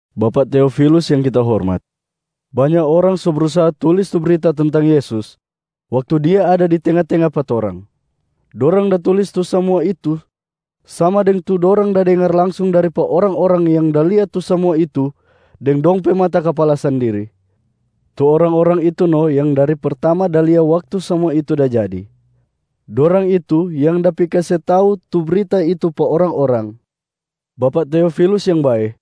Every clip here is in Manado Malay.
Bapak Teofilus yang kita hormat. Banya orang so brusaha tulis tu brita tentang Yesus waktu Dia ada di tenga-tenga pa torang. Dorang da tulis tu samua itu sama deng tu dorang da dengar langsung dari pa orang-orang yang da lia tu samua itu deng dong pe mata kapala sandiri. Tu orang-orang itu no yang dari pertama da lia waktu samua itu da jadi, dorang itu yang da pi kase tau tu brita itu pa orang-orang. Bapak Teofilus yang bae,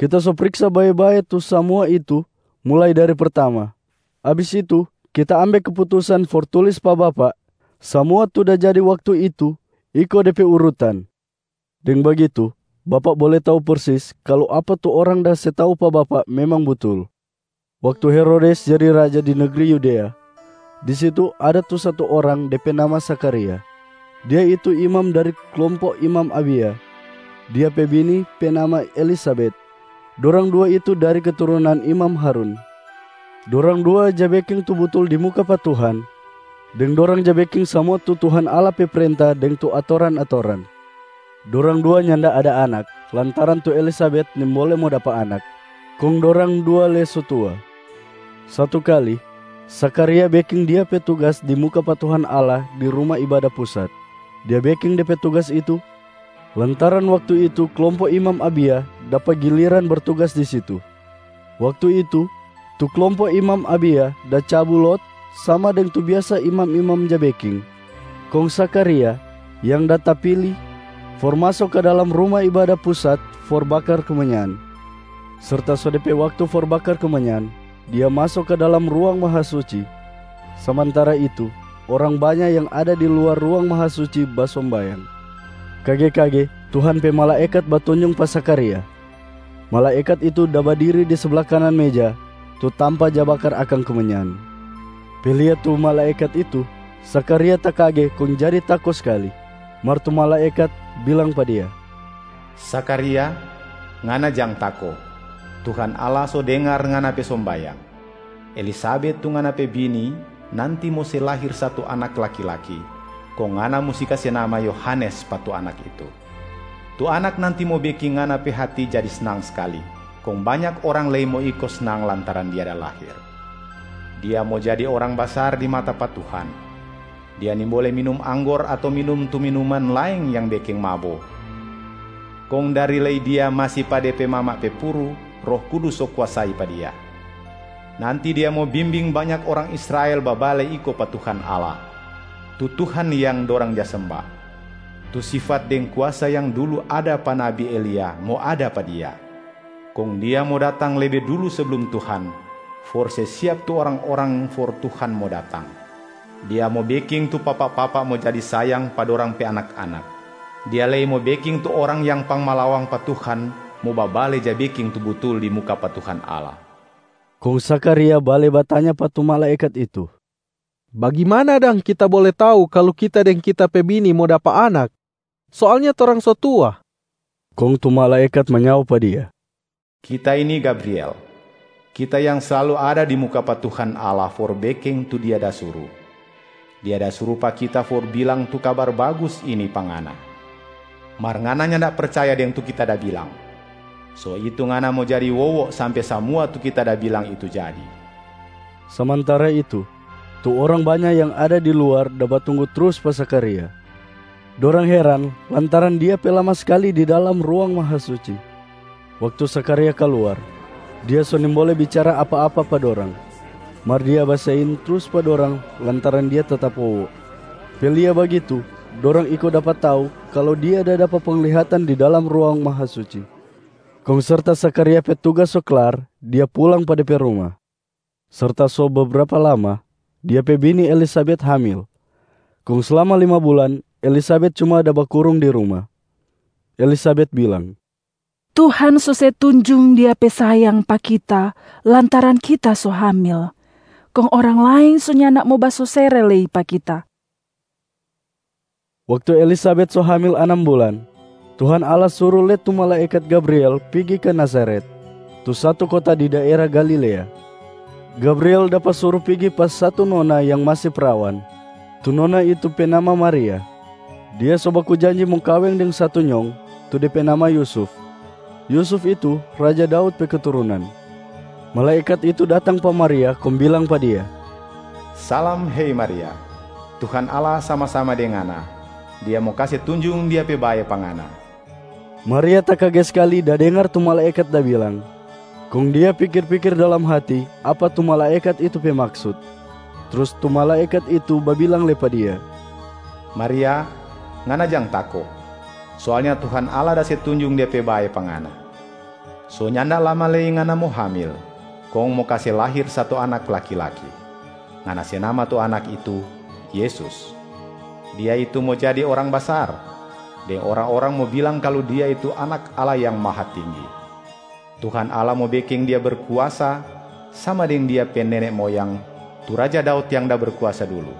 kita so priksa bae-bae tu samua itu mulai dari pertama. Abis itu kita ambe keputusan for tulis pa bapak samua tu da jadi waktu itu iko de pe urutan. Deng bagitu, bapak bole tau persis kalu apa tu orang da se tau pa bapak memang butul. Waktu Herodes jadi raja di negri Yudea, di situ ada tu satu orang de pe nama Zakharia. Dia itu imam dari klompo imam Abia. Dia pe bini pe nama Elisabet. Dorang dua itu dari keturunan imam Harun. Dorang dua ja beking tu butul di muka pa Tuhan, deng dorang ja beking samua tu Tuhan Allah pe prenta deng tu atoran-atoran. Dorang dua nyanda ada anak lantaran tu Elisabet nimbole mo dapa anak, kong dorang dua lei so tua. Satu kali, Zakharia beking dia pe tugas di muka pa Tuhan Allah di Ruma Ibada Pusat. Dia beking de pe tugas itu lantaran waktu itu klompo imam Abia dapa giliran bertugas di situ. Waktu itu tu klompo imam Abia da cabu lot sama deng tu biasa imam-imam ja beking, kong Zakharia yang da tapili for maso ka dalam Ruma Ibada Pusat for bakar kemenyan. Serta so de pe waktu for bakar kemenyan, dia maso ka dalam Ruang Mahasuci. Samantara itu orang banya yang ada di luar Ruang Mahasuci basombayang. Kage-kage Tuhan pe malaekat batunjung pa Zakharia. Malaekat itu da badiri di sabla kanan meja, tu tampa ja bakar akang kemenyan. Pe lia tu malaekat itu, Zakharia takage kong jadi tako skali. Mar tu malaekat bilang pa dia, “Zakharia, ngana jang tako! Tuhan Allah so dengar ngana pe sombayang. Elisabet tu ngana pe bini nanti mo se lahir satu anak laki-laki, kong ngana musti kase nama Yohanes pa tu anak itu. Tu anak nanti mo beking ngana pe hati jadi snang skali, kong banya orang lei mo iko snang lantaran dia da lahir. Dia mo jadi orang basar di mata pa Tuhan. Dia nimbole minum anggor ato minum tu minuman laeng yang beking mabo. Kong dari lei dia masi pa de pe mama pe puru, Roh Kudus so kuasai pa dia. Nanti dia mo bimbing banya orang Israel babale iko pa Tuhan Allah, tu Tuhan yang dorang ja semba. Tu sifat deng kuasa yang dulu ada pa nabi Elia mo ada pa dia. Kong dia mo datang lebe dulu seblum Tuhan for se siap tu orang-orang for Tuhan mo datang. Dia mo beking tu papa-papa mo jadi sayang pa dorang pe anak-anak. Dia lei mo beking tu orang yang pangmalawang pa Tuhan mo babale ja beking tu butul di muka pa Tuhan Allah.” Kong Zakharia bale batanya pa tu malaekat itu, “Bagimana dang kita bole tau kalu kita deng kita pe bini mo dapa anak? Soalnya torang so tua.” Kong tu malaekat manyao pa dia, “Kita ini Gabriel, kita yang slalu ada di muka pa Tuhan Allah for beking tu Dia da suru. Dia da suru pa kita for bilang tu kabar bagus ini pa ngana. Mar ngana nyanda percaya deng tu kita da bilang. So itu ngana mo jadi wowo sampe samua tu kita da bilang itu jadi.” Samantara itu, tu orang banya yang ada di luar da batunggu trus pa Zakharia. Dorang heran lantaran dia pe lama skali di dalam Ruang Mahasuci. Waktu Zakharia kaluar, dia so nimbole bicara apa-apa pa dorang. Mar dia basein trus pa dorang lantaran dia tetap wowo. Pe lia bagitu, dorang iko dapa tau kalu dia da dapa penglihatan di dalam Ruang Mahasuci. Kong serta Zakharia pe tugas so klar, dia pulang pa de pe ruma. Serta so bebrapa lama, dia pe bini Elisabet hamil. Kong slama lima bulan Elisabet cuma da bakurung di ruma. Elisabet bilang, “Tuhan so se tunjung Dia pe sayang pa kita lantaran kita so hamil, kong orang laeng so nyanda mo basosere lei pa kita.” Waktu Elisabet so hamil anam bulan, Tuhan Allah suru lei tu malaekat Gabriel pigi ka Nazaret, tu satu kota di daera Galilea. Gabriel dapa suru pigi pa satu nona yang masi prawan. Tu nona itu pe nama Maria. Dia so baku janji mo kaweng deng satu nyong, tu de pe nama Yusuf. Yusuf itu raja Daud pe keturunan. Malaekat itu datang pa Maria kong bilang pa dia, “Salam hei Maria. Tuhan Allah sama-sama deng ngana, Dia mo kase tunjung Dia pe bae pa ngana.” Maria takage skali da dengar tu malaekat da bilang, kong dia pikir-pikir dalam hati apa tu malaekat itu pe maksut. Trus tu malaekat itu babilang lei pa dia, “Maria, ngana jang tako. Soalnya Tuhan Allah da se tunjung Dia pe bae pa ngana. So nyanda lama lei ngana mo hamil kong mo kase lahir satu anak laki-laki. Ngana se nama tu anak itu, ‘Yesus’.a Dia itu mo jadi orang basar, deng orang-orang mo bilang kalu Dia itu Anak Allah Yang Mahatinggi. Tuhan Allah mo beking Dia berkuasa sama deng Dia pe nene moyang tu raja Daud yang da berkuasa dulu.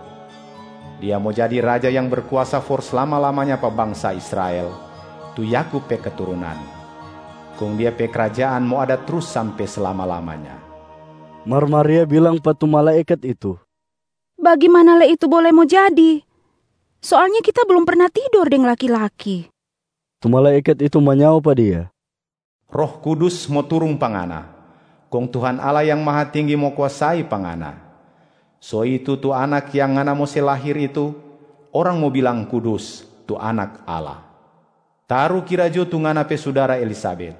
Dia mo jadi raja yang berkuasa for slama-lamanya pa bangsa Israel, tu Yakub pe keturunan. Kong Dia pe krajaan mo ada trus sampe slama-lamanya.” Mar Maria bilang pa tu malaekat itu, “Bagimana lei itu bole mo jadi? Soalnya kita blum perna tidor deng laki-laki.” Tu malaekat itu manyao pa dia, “Roh Kudus mo turung pa ngana, kong Tuhan Allah Yang Mahatinggi mo kuasai pa ngana. So itu tu Anak yang ngana mo se lahir itu, orang mo bilang kudus, tu Anak Allah. Tarukira jo, tu ngana pe sudara Elisabet,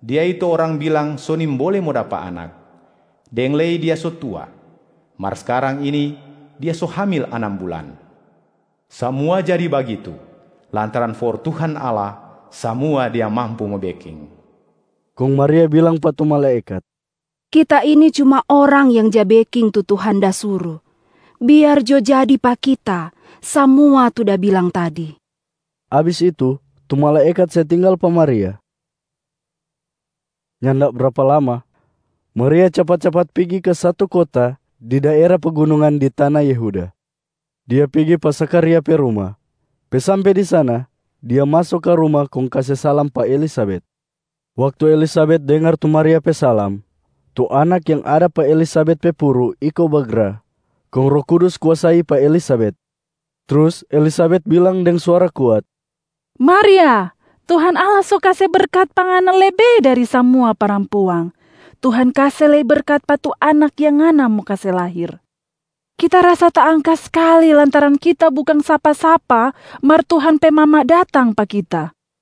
dia itu orang bilang so nimbole mo dapa anak, deng lei dia so tua. Mar skarang ini dia so hamil anam bulan. Samua jadi bagitu, lantaran for Tuhan Allah samua Dia mampu mo beking.” Kong Maria bilang pa tu malaekat, “Kita ini cuma orang yang ja beking tu Tuhan da suru. Biar jo jadi pa kita samua tu da bilang tadi.” Abis itu, tu malaekat se tinggal pa Maria. Nyanda brapa lama, Maria capat-capat pigi ka satu kota di daera pegunungan di tana Yehuda. Dia pigi pa Zakharia pe ruma. Pe sampe di sana, dia maso ka ruma kong kase salam pa Elisabet. Waktu Elisabet dengar tu Maria pe salam, tu anak yang ada pa Elisabet pe puru iko bagra, kong Roh Kudus kuasai pa Elisabet. Trus Elisabet bilang deng suara kuat, “Maria, Tuhan Allah so kase berkat pa ngana lebe dari samua parampuang! Tuhan kase lei berkat pa tu Anak yang ngana mo kase lahir. Kita rasa taangka skali lantaran kita bukang sapa-sapa mar Tuhan pe mama datang pa kita.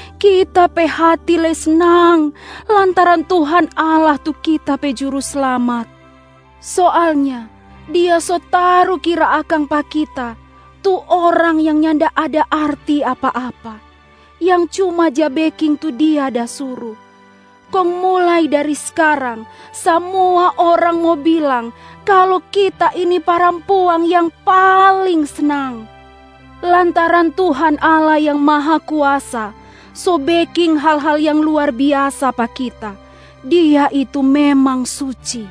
Kita pe hati lei snang lantaran Tuhan Allah tu kita pe Juruslamat. Soalnya Dia so tarukira akang pa kita, tu orang yang nyanda ada arti apa-apa, yang cuma ja beking tu Dia da suru. Kong mulai dari skarang samua orang mo bilang kalu kita ini parampuang yang paling snang, lantaran Tuhan Allah Yang Mahakuasa so beking hal-hal yang luar biasa pa kita. Dia itu memang suci.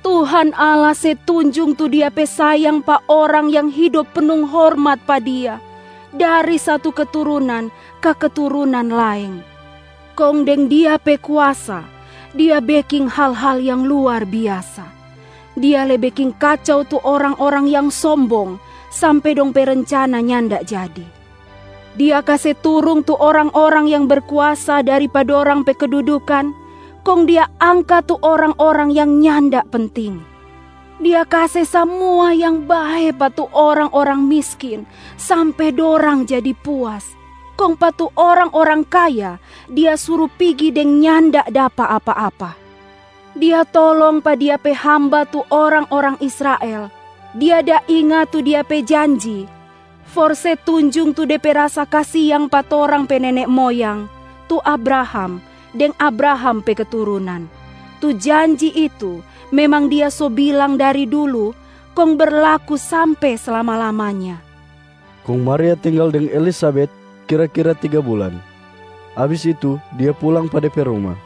Tuhan Allah se tunjung tu Dia pe sayang pa orang yang hidop punung hormat pa Dia, dari satu keturunan ka keturunan laeng. Kong deng Dia pe kuasa, Dia beking hal-hal yang luar biasa. Dia lei beking kacau tu orang-orang yang sombong sampe dong pe rencana nyanda jadi. Dia kase turung tu orang-orang yang berkuasa dari pa dorang pe kedudukan, kong Dia angka tu orang-orang yang nyanda penting. Dia kase samua yang bae pa tu orang-orang miskin sampe dorang jadi puas, kong pa tu orang-orang kaya Dia suru pigi deng nyanda dapa apa-apa. Dia tolong pa Dia pe hamba tu orang-orang Israel, Dia da inga tu Dia pe janji for se tunjung tu De pe rasa kasiang pa torang pe nene moyang, tu Abraham deng Abraham pe keturunan. Tu janji itu memang Dia so bilang dari dulu kong berlaku sampe slama-lamanya.” Kong Maria tinggal deng Elisabet kira-kira tiga bulan, abis itu dia pulang pa de pe ruma.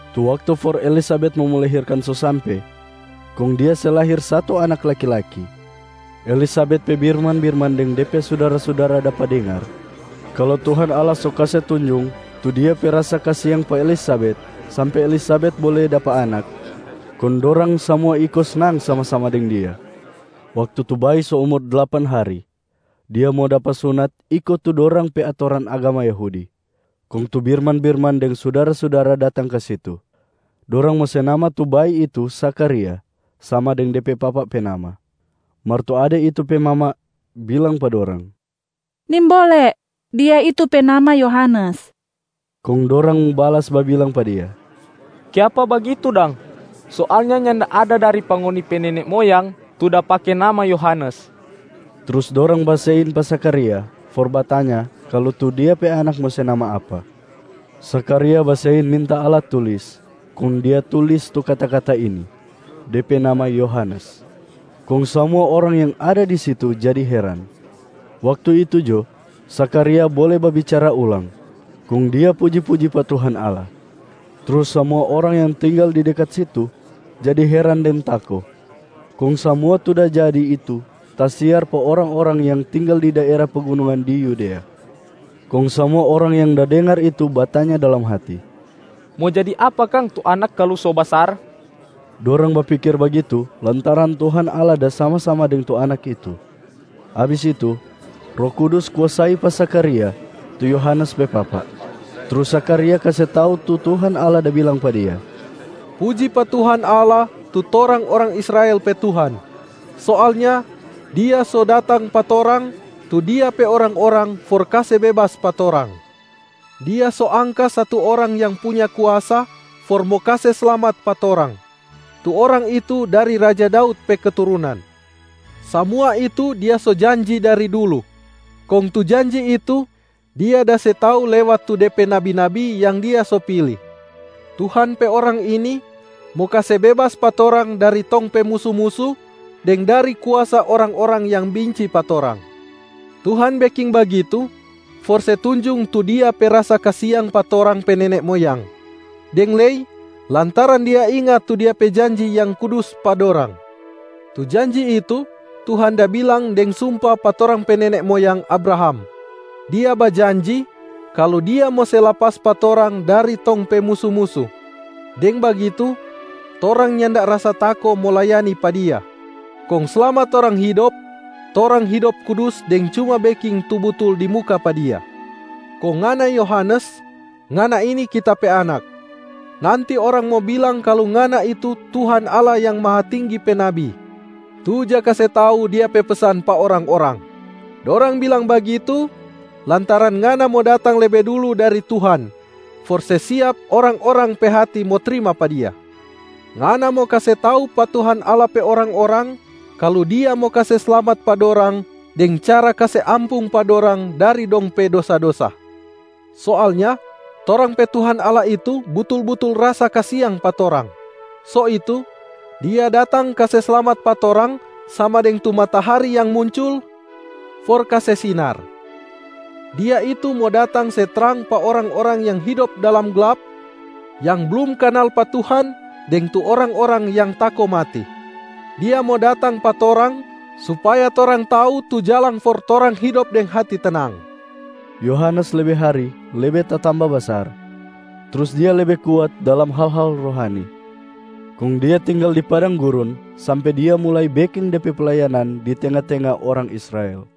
Tu waktu for Elisabet mo melahirkan so sampe, kong dia se lahir satu anak laki-laki. Elisabet pe birman-birman deng de pe sudara-sudara dapa dengar kalu Tuhan Allah so kase tunjung tu Dia pe rasa kasiang pa Elisabet sampe Elisabet bole dapa anak, kong dorang samua iko snang sama-sama deng dia. Waktu tu bayi so umur dlapan hari, dia mo dapa sunat iko tu dorang pe atoran agama Yahudi. Kong tu birman-birman deng sudara-sudara datang ka situ. Dorang mo se nama tu bayi itu Zakharia sama deng de pe papa pe nama. Mar tu ade itu pe mama bilang pa dorang, “Nimbole! Dia itu pe nama Yohanes.” Kong dorang balas babilang pa dia, “Kiapa bagitu dang? Soalnya nyanda ada dari pa ngoni pe nene moyang tu da pake nama Yohanes.” Trus dorang basein pa Zakharia for batanya kalu tu dia pe anak mo se nama apa. Zakharia basein minta alat tulis, kong dia tulis tu kata-kata ini, “De pe nama Yohanes”. Kong samua orang yang ada di situ jadi heran. Waktu itu jo, Zakharia bole babicara ulang, kong dia puji-puji pa Tuhan Allah. Trus samua orang yang tinggal di dekat situ jadi heran deng tako. Kong samua tu da jadi itu tasiar pa orang-orang yang tinggal di daera pegunungan di Yudea. Kong samua orang yang da dengar itu batanya dalam hati, “Mo jadi apa kang tu anak kalu so basar?” Dorang bapikir bagitu lantaran Tuhan Allah da sama-sama deng tu anak itu. Abis itu, Roh Kudus kuasai pa Zakharia, tu Yohanes pe papa. Trus Zakharia kase tau tu Tuhan Allah da bilang pa dia, “Puji pa Tuhan Allah, tu torang orang Israel pe Tuhan! Soalnya Dia so datang pa torang, tu Dia pe orang-orang for kase bebas pa torang. Dia so angka satu Orang yang punya kuasa for mo kase slamat pa torang. Tu Orang itu dari raja Daud pe keturunan. Samua itu Dia so janji dari dulu, kong tu janji itu Dia da se tau lewat tu De pe nabi-nabi yang Dia so pili. Tuhan pe Orang ini mo kase bebas pa torang dari tong pe musu-musu, deng dari kuasa orang-orang yang binci pa torang. Tuhan beking bagitu for se tunjung tu Dia pe rasa kasiang pa torang pe nene moyang, deng lei lantaran Dia inga tu Dia pe janji yang kudus pa dorang. Tu janji itu Tuhan da bilang deng sumpa pa torang pe nene moyang Abraham. Dia bajanji kalu Dia mo se lapas pa torang dari tong pe musu-musu. Deng bagitu, torang nyanda rasa tako mo layani pa Dia. Kong slama torang hidop, torang hidop kudus deng cuma beking tu butul di muka pa Dia. Kong ngana Yohanes, ngana ini kita pe anak. Nanti orang mo bilang kalu ngana itu Tuhan Allah Yang Mahatinggi pe nabi, tu ja kase tau Dia pe pesan pa orang-orang. Dorang bilang bagitu, lantaran ngana mo datang lebe dulu dari Tuhan, for se siap orang-orang pe hati mo trima pa Dia. Ngana mo kase tau pa Tuhan Allah pe orang-orang, kalu Dia mo kase slamat pa dorang deng cara kase ampung pa dorang dari dong pe dosa-dosa. Soalnya torang pe Tuhan Allah itu butul-butul rasa kasiang pa torang. So itu Dia datang kase slamat pa torang sama deng tu matahari yang muncul for kase sinar. Dia itu mo datang se trang pa orang-orang yang hidop dalam glap, yang blum kanal pa Tuhan deng tu orang-orang yang tako mati. Dia mo datang pa torang supaya torang tau tu jalang for torang hidop deng hati tenang.” Yohanes lebe hari lebe tatamba basar, trus dia lebe kuat dalam hal-hal rohani. Kong dia tinggal di padang gurun sampe dia mulai beking de pe playanan di tenga-tenga orang Israel.